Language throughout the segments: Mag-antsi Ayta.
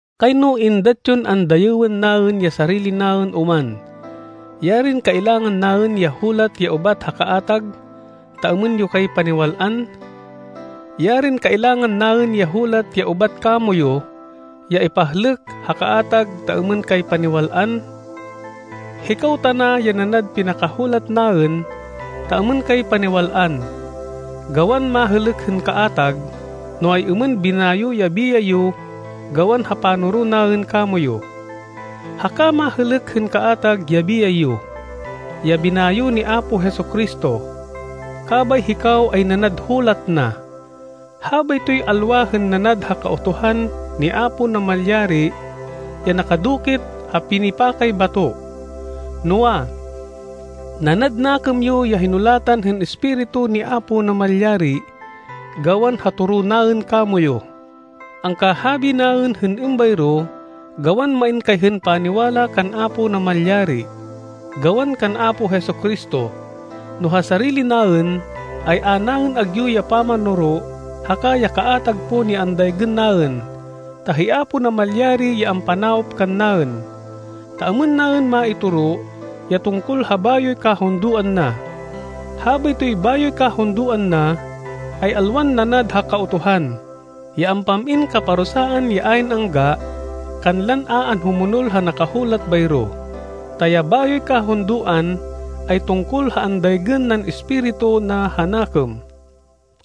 Kayno êndat yon andayêwên naên ya sarili naên oman. Yarin kailangan naên ya hulat ya ubat ha kaatag ta êmên yo kay paniwal-an! Yarin kailangan naên ya hulat ya ubat kamoyu ya ipahlêk ha kaatag ta êmên kay paniwal-an! Hikaw tana ya nanad pinakahulat naên ta êmên kay paniwal-an, gawan mahêlêk hên kaatag, no ay-êmên binayo ya biyay yo gawan ha panoro naên kamoyu. Haka mahêlêk hên kaatag ya biyay yo, ya binayo ni Apo Jesu-Cristo, kabay hikaw ay nanad hulat na. Habaytoy alwa hên nanad ha Kautuhan ni Apo Namalyari ya nakadukit ha pinipakay bato, noa, nanad nakêm yo ya hinulatan hên Espiritu ni Apo Namalyari, gawan ha toro naên kamoyu. Angkahabi naên hên êmbayro gawan main kay hên paniwala kan Apo Namalyari, gawan kan Apo Jesu-Cristo. No ha sarili naên, ay a naên agyu ya pamanoro haka ya kaatag pon ya andaygên naên, ta hi Apo Namalyari ya ampanawop kannaên, ta êmên naên maitoro ya tungkol ha bayoy kahundoan na. Habaytoy bayoy kahundoan na, ay alwan nanad ha Kautuhan, ya ampam-in kaparusaan ya ayn angga kanlan a anhumonol ha nakahulat bayro. Ta ya bayoy kahundoan ay tungkol ha andaygên nan Espiritu na ha nakêm,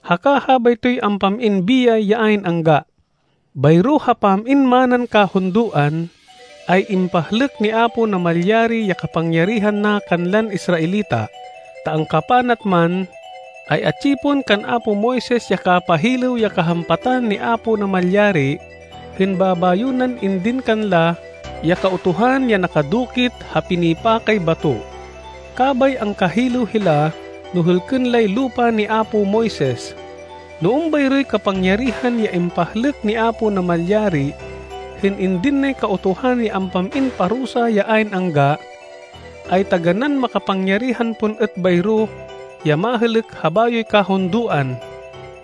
haka habaytoy ampam-in biyay ya ayn angga. Bayro ha pam-in manan kahundoan, ay impahlêk ni Apo Namalyari ya kapangyarihan na kanlan Israelita, ta angkapanat man, ay atsi pon kan apo Moises ya kapahilêw ya kahampatan ni Apo Namalyari hên babayo nan indin kanla ya Kautuhan ya nakadukit ha pinipakay bato. Kabay angkahilêw hila no hêlkên lay lupa ni apo Moises. No êmbayroy kapangyarihan ya impahlêk ni Apo Namalyari hên indin nay Kautuhan ya ampam-in parusa ya ayn angga, ay taganán makapangyarihan pon êt bayro ya mahêlêk ha bayoy kahundoan,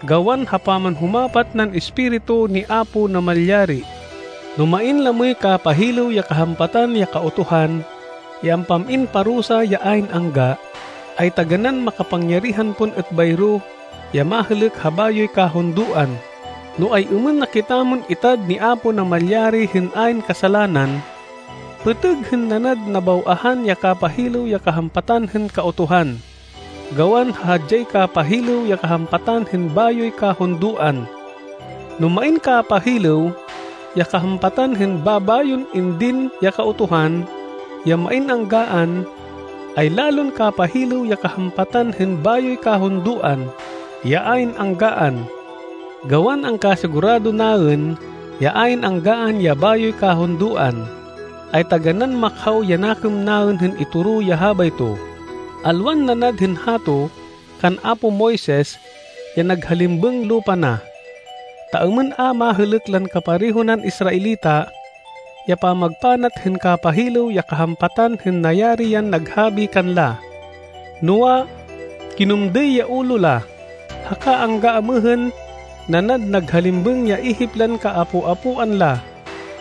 gawan ha pamanhumapat nan Espiritu ni Apo Namalyari! No main lamoy kapahilêw ya kahampatan ya Kautuhan ya ampam-in parusa ya ayn angga, ay taganán makapangyarihan pon êt bayro ya mahêlêk ha bayoy kahundoan, no ay-êmên na kitamon itad ni Apo Namalyari hên ayn kasalanan. Pêtêg hên nanad nabaw-ahan ya kapahilêw ya kahampatan hên Kautuhan, gawan ha hadyay kapahilêw ya kahampatan hên bayoy kahundoan! No main kapahilêw ya kahampatan hên babayon indin ya Kautuhan, ya main anggaan, ay lalon kapahilêw ya kahampatan hên bayoy kahundoan, ya ayn anggaan! Gawan angkasigurado naên ya ayn anggaan ya bayoy kahundoan, ay taganán makhaw ya nakêm naên hên itoro ya habayto, alwan nanad hên hato kan apo Moises ya naghalimbêng lupa na, ta êmên a mahêlêk lan kapareho nan Israelita ya pamagpanat hên kapahilêw ya kahampatan hên nayari yan naghabi kanla. Noa, kinumdêy ya ulo la, haka angga amêhên nanad naghalimbêng ya ihip lan kaapo-apoan la,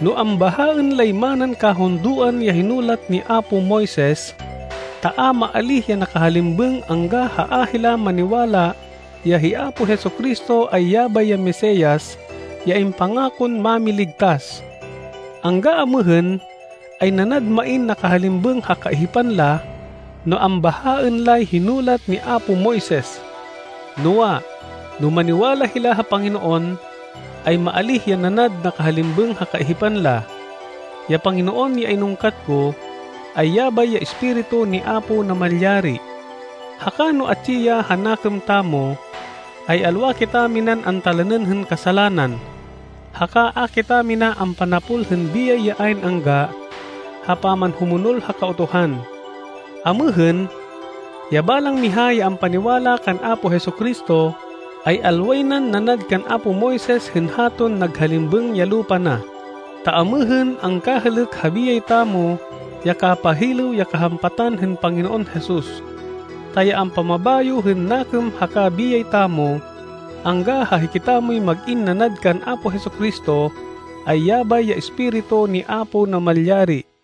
no ambahaên lay manan kahundoan ya hinulat ni apo Moises, ta a maalíh ya nakahalimbêng angga ha a hila maniwala ya hi Apo Jesu-Cristo ay yabay ya Mesias, ya impangakon Mámiligtas. Angga amêhên, ay nanad main nakahalimbêng ha kaihipan la no ambahaên lay hinulat ni apo Moises. Noa, no maniwala hila ha Panginoon, ay maalíh ya nanad nakahalimbêng ha kaihipan la. Ya Panginoon ya inungkat ko, ay yabay ya Espiritu ni Apo Namalyari, haka no atsi ya ha nakêm tamo, ay alwa kitaminan antalanên hên kasalanan, haka a kitamina ampanapol hên biyay ya ayn angga ha pamanhumonol ha Kautuhan. Amêhên, ya balang miha ya ampaniwala kan Apo Jesu-Cristo ay alway nan nanad kan apo Moises hên haton naghalimbêng ya lupa na, ta amêhên angkahêlêk ha biyay tamo ya kapahilêw ya kahampatan hên Panginoon Jesus. Ta ya ampamabayo hên nakêm haka biyay tamo, angga ha hikitamoy mag-in nanad kan Apo Jesu-Cristo, ay yabay ya Espiritu ni Apo Namalyari.